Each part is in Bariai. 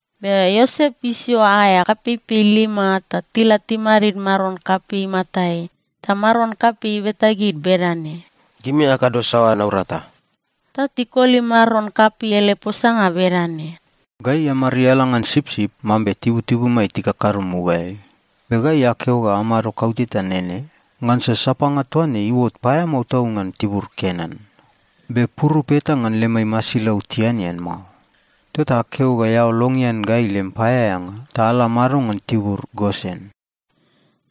Be Iosep isio aea kapeipei lima ta tila timadid maron kapei imatai. Ta maron kapei ibeta gid bedane, “Gimi akado saoa naurata?” Ta tikoli maron kapei ele posanga bedane, “Gai amariala ngan sipsip, mambe tibutibumai tikakado mugaeai. Be gai akeo ga amado kauteta nene, ngansa sapanga toa ne iuot paeamao tau ngan tibur Kenan. Be purup eta ngan lemai masilau tianean mao. Tota akeo ga eao longean gai lem paeaeanga ta ala amado ngan tibur Gosen.”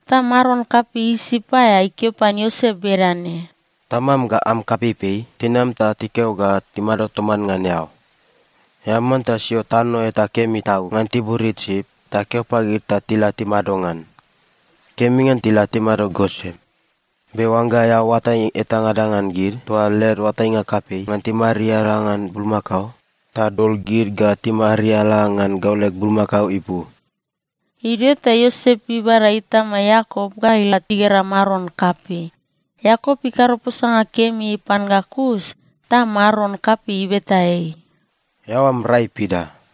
Ta maron kapei Isip aea ikeo pan Iosep bedane, “Tamam ga am kapeipei tinam ta tikeo ga timado toman ngan eao. Eao manta sio tano eta kemi tau ngan tibur Isip ta keo pagid ta tila timado ngan. Kemi ngan tila timado Gosen. Be oangga eao oatai etangada ngan gid toa led oatainga kapei ngan timariala ngan bulmakao, ta dol gid ga timariala ngan gau leg bulmakao ipu.” Idio ta Iosep ibada itama Iakop ga ila igera maron kapei. Iakop ikado posanga kemi pan ga kus ta maron kapei ibeta ei, “Eao am rai pida?”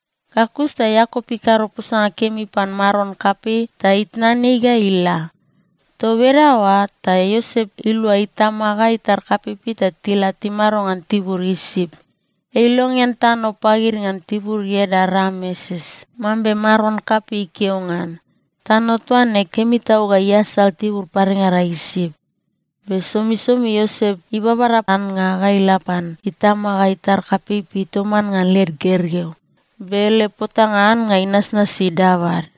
Ga kus ta Iakop ikado posanga kemi pan maron kapei ta itnan ei ga ila. Toa bedaoa ta Iosep ilua itama ga itar kapeipei ta tila timado ngan tibur Isip. Ei ilongean tano pagid ngan tibur ieda Rameses, mambe maron kapei ikeo ngan. Tano toa ne kemi tau ga iasal tibur padengada Isip. Be somisomi Iosep ibabada annga ga ila pan itama ga itar kapeipei toman ngan led gergeu, be ele potanga annga inasnasi dabad.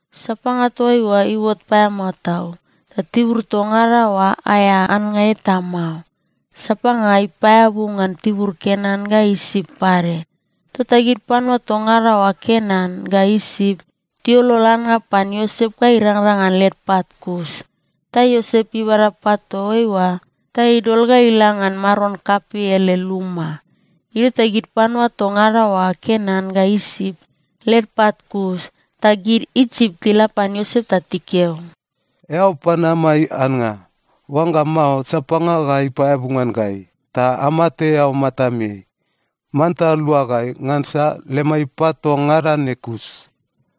Sapanga toa oa iuot paeamao tau, ta tibur toa ngada oa aea annga eta mao. Sapanga ipaeabu ngan tibur Kenan ga Isip pade. Tota gid panua toa ngada oa Kenan ga Isip tiuolol annga pan Iosep ga irangrang ngan led pat kus. Ta Iosep ibada pat toa oa ta idol ga ila ngan maron kapei ele luma. Idio ta gid panua toa ngada oa Kenan ga Isip led pat kus, ta gid Isip tila pan Iosep ta tikeo, “Eao pan amai annga. Oangga mao, sapanga ga ipaeabu ngan gai, ta amate eao matameai. Manta lua gai, ngansa lemai pat toa ngada ne kus.”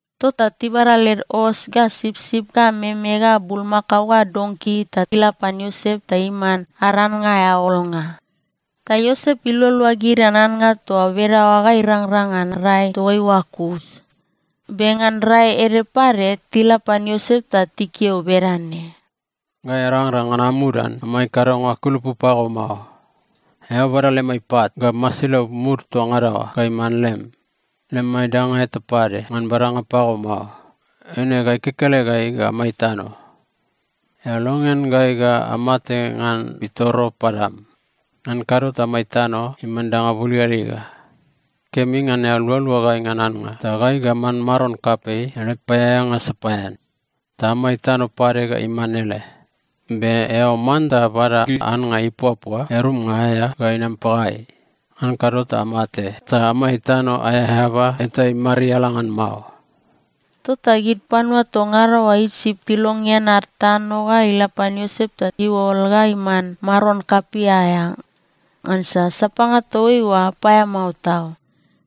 Tota tibada led os ga sipsip ga meme ga bulmakao ga donki ta ila pan Iosep ta iman ad annga aea olnga. Ta Iosep ilualua gid ngan annga toa bedaoa ga irangrang ngan rai toaiua kus. Be ngan rai ede pade, tila pan Iosep ta tikeo bedane, “Gai arangrang ngan amudan amai kadonga kulupu pago mao. Eao bada lemai pat ga masilau mud toa ngada oa ga iman lem. Lemai danga eta pade ngan badanga pago mao. Eine gai kekelegai ga amai tano. Eao longean gai ga amate ngan pitoro padam. Ngan kado ta amai tano iman danga buligaliga. Kemi ngan eao lualua gai ngan annga, ta gai ga aman maron kapei ele paeaeanga sapaean. Ta amai tano pade ga iman ele. Be eao manta bada gid annga ipuapua earumnga aea ga inam pagai. Ngan kado ta amate ta amai tano aea eaba eta imariala ngan mao.” Tota gid panua toa ngada oa Isip tilongean ad tano ga ila pan Iosep ta iuol ga iman maron kapei aea, ngansa sapanga toa oa paeamao tau.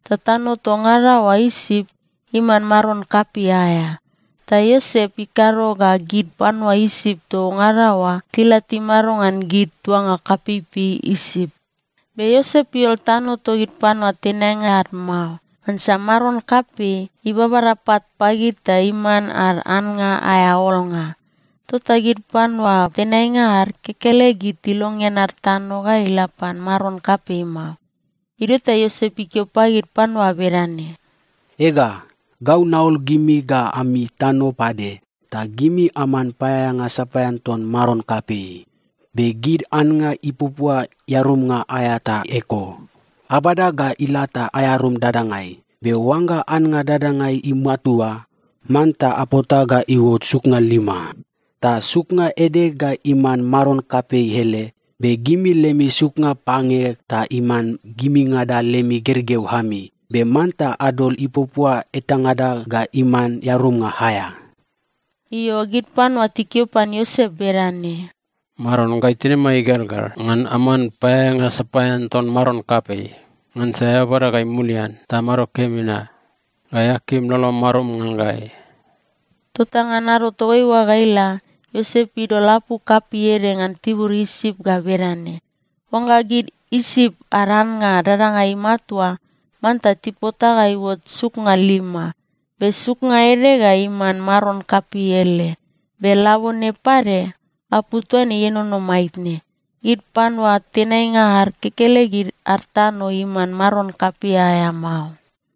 Ta tano toa ngada oa Isip iman maron kapei aea. Ta Iosep ikado ga gid panua Isip toa ngada oa tila timado ngan gid tuanga kapeipei Isip. Be Iosep iuol tano togid panua tenainga ad mao, ngansa maron kapei ibabada pat pagid ta iman ad annga aea olnga. Tota gid panua tenainga ad kekelegid tilongean ad tano ga ila pan maron kapei mao. Idio ta Iosep ikeo pagid panua bedane, “Ega, gau naol gimi ga ami tano pade, ta gimi aman paeaeanga sapaean ton maron kapei. Be gid annga ipuapua earumnga aea ta eko. Abada ga ila ta aearum dadangai. Be oangga annga dadangai imatua, manta apota ga iuot suknga lima. Ta suknga ede ga iman maron kapei ele. Be gimi lemi suknga pange ta iman gimingada lemi gergeu ami. Be manta adol ipuapua etangada ga iman earumnga aea.” Io, gid panua tikeo pan Iosep bedane, “Maron, gai tinimai igelgel ngan aman paeaeanga sapaean ton maron kapei, ngansa eao bada gai mulian ta amado kemi na. Gai akim lolom marum ngan gai.” Tota ngan ado toaiua ga ila, Iosep idol apu kapei ede ngan tibur Isip ga bedane: Oangga gid Isip ad annga dadangai imatua, manta tipota ga iuot suknga lima. Be suknga ede ga iman maron kapei ele. Be labone pade, apu toa ne ienono maitne. Gid panua tenainga ad kekelegid ad tano iman maron kapei aea mao.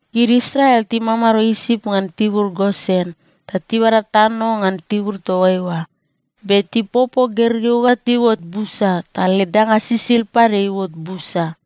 Gid Israel timamado Isip ngan tibur Gosen, ta tibada tano ngan tibur toa eoa. Be tipopo gergeu ga tiuot busa ta led danga sisid pade iuot busa.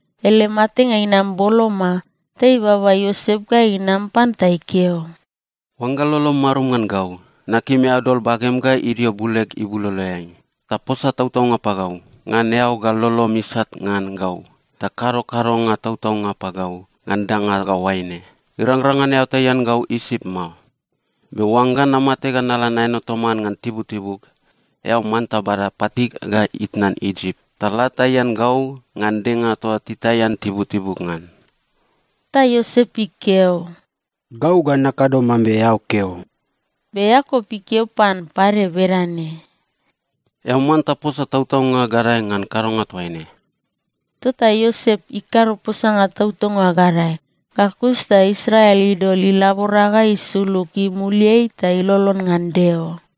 Ele matenga inam boloma, ta ibaba Iosep ga inam pan ta ikeo, “Oangga lolom marum ngan gau, nakim eao dol bagem ga idio buleg ibuloloeai, ta posa tautaunga pagau ngan eao ga lolom isat ngan gau ta kado kadonga tautaunga pagau ngan danga ga oaine: Irangrang ngan eao taian gau Isip mao. Be oangga namate ga nala naeno toman ngan tibutibug, eao manta bada patig ga itnan Isip, ta la taian gau ngan denga toa titaian tibutibug ngan.” Ta Iosep ikeo, “Gau ga nakado mambe eao keo.” Be Iakop ikeo pan pade bedane, “Eao manta posa tautaunga gadae ngan kadonga toaine.” Tota Iosep ikado posanga tautaunga gadae. Ga kus ta Israel idol ilabora ga isulug imuliai ta ilolon ngan Deo.